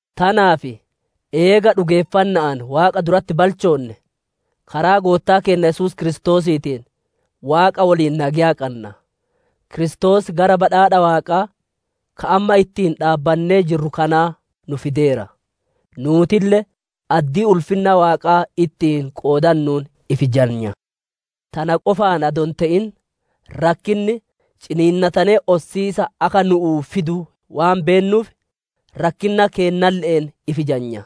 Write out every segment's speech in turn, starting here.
Tanaaf, eega dhugeeffanna'aan Waaqa duratti balchoonne, karaa Goottaa keenna Yesuus Kiristoosiitiin Waaqa woliin nageya qanna. Kiristoos gara badhaadha Waaqaa, ka amma ittiin dhaabbannee jirru kanaa nu fideera; nuutille addii ulfinna Waaqaa ittiin qoodannuun ifi jajna. Tana qofaan adoo hin te'in, rakkinni ciniinnatanee ossiisa akka nu'uu fidu waan beennuuf, rakkinna keennalle'een ifi jajna.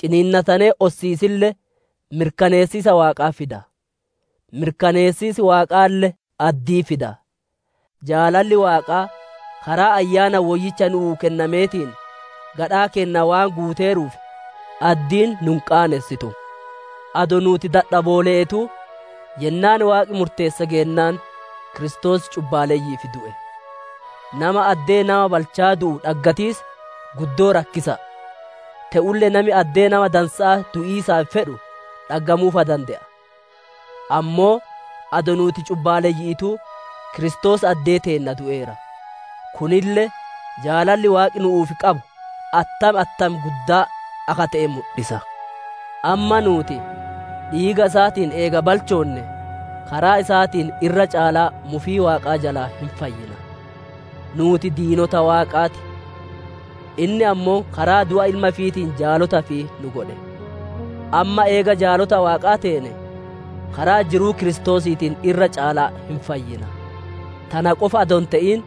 Ciniinnatanee ossiisille mirkaneessiisa Waaqaa fida; mirkaneessiis Waaqaalle addii fida. Jaalalli Waaqaa karaa Ayyaana Woyyicha nuuf kennameetiin, gadhaa keenna waan guuteeruuf, addiin nu hin qaanessitu. Adoo nuuti dadhaboole'eetuu, yennaan Waaqi murteesse geennaan Kiristoos cubbaaleyyi'iif du'e. Nama addee nama balcha'a du'u dhaggatiis guddoo rakkisa'a; te'ulle nami addee nama dansa'a du'iisaaf fedhu dhaggamuu fa dande'a. Ammoo adoo nuuti cubbaaleyyi'iituu Kiristoos addee teenna du'eera; kunille jaalalli Waaqi nu'uuf qabu attam attam guddaa akka te'e mudhisa. Amma nuuti dhiiga isaatiin eega balchoonnee, karaa isaatiin irra caalaa mufii Waaqaa jalaa hin baana. Nuuti diinota Waaqaa ti; inni ammoo karaa du'a Ilma ifiitiin jaalota ifii nu godhe. Amma eega jaalota Waaqaa teene, karaa jiruu Kiristoosiitiin irra caalaa hin fayyina. Tana qofa adoo hin te'in,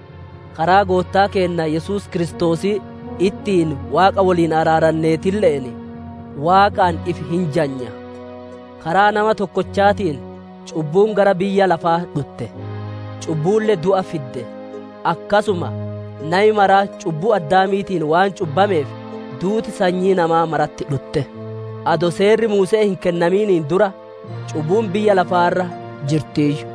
karaa Goottaa keenna Yesuus Kiristoosii ittiin Waaqa woliin araaranneetille'een, Waaqaan ifi hin jajna. Karaa nama tokkochaatiin cubbuun gara biyya lafaa dhutte; cubbuulle du'a fidde. Akkasuma nami maraa cubbuu Addaamiitiin waan cubbameef, duuti sanyii namaa maratti dhutte. Adoo Seerri Muuse'ee hin kennamin dura cubbuun biyya lafaa irra jirtiiyyuu;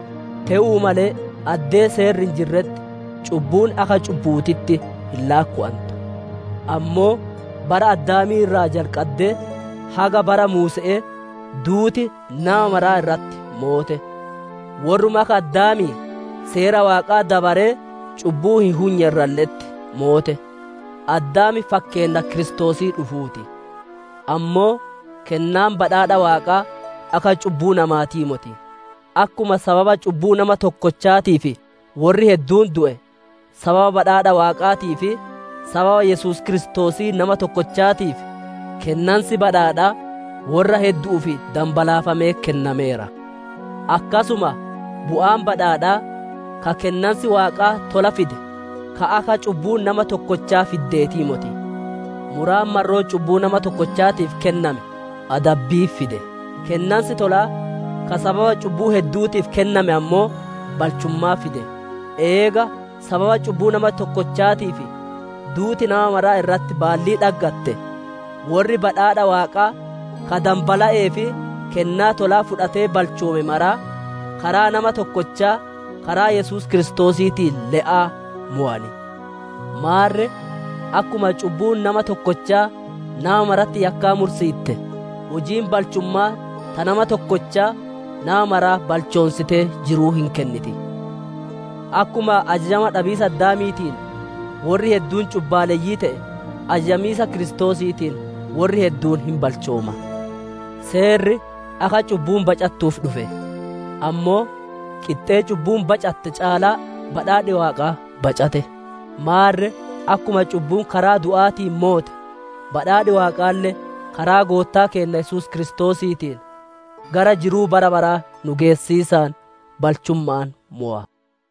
te'uu malee addee Seerri hin jirretti, cubbuun akka cubbu'uutitti hin laakkowantu. Ammoo bara Addaamii irraa jalqaddee haga bara Muuse'ee, duuti nama mara irratti moote; worruma akka Addaamii Seera Waaqaa dabaree cubbuu hin hunye irralle'etti moote. Addaam fakkeenna Kiristoosii dhufuu ti. Ammoo kennaan badhaadha Waaqaa akka cubbuu namaatii moti; akkuma sababa cubbuu nama tokkochaatiif worri hedduun du'e, sababa badhaadha Waaqaatii fi sababa Yesuus Kiristoosii nama tokkochaatiif, kennansi badhaadhaa worra heddu'uuf danbalaafamee kennameera. Akkasuma bu'aan badhaadhaa, ka kennansi Waaqaa tolaa fide, ka akka cubbuun nama tokkochaa fiddeetii moti; muraan marroo cubbuu nama tokkochaatiif kenname adabbii fide; kennansi tolaa ka sababa cubbuu heddu'uutiif kenname ammoo balchummaa fide. Eega sababa cubbuu nama tokkochaatiif duuti nama mara irratti baallii dhaggatte, worri badhaadha Waaqaa ka danbala'ee fi kennaa tolaa fudhatee balchoome maraa, karaa nama tokkochaa, karaa Yesuus Kiristoosiitiin le'aa mowan. Maarre, akkuma cubbuun nama tokkochaa nama maratti yakkaa mursiitte, hujiin balchumma'aa ta nama tokkochaa nama mara balchoonsitee jiruu hin kenniti. Akkuma ajajama dhabiisa Addaamiitiin worri hedduun cubbaalleyyii te'e, ajajamiisa Kiristoosiitiin worri hedduun hin balchooma. Seerri akka cubbuun bacattuuf dhufe; ammoo qixxee cubbuun bacatte caalaa badhaadhi Waaqaa bacate. Maarre, akkuma cubbuun karaa du'aatiin moote, badhaadhi Waaqaalle karaa Goottaa keenna Yesuus Kiristoosiitiin, gara jiruu bara baraa nu geessiisaan balchumma'aan mowa.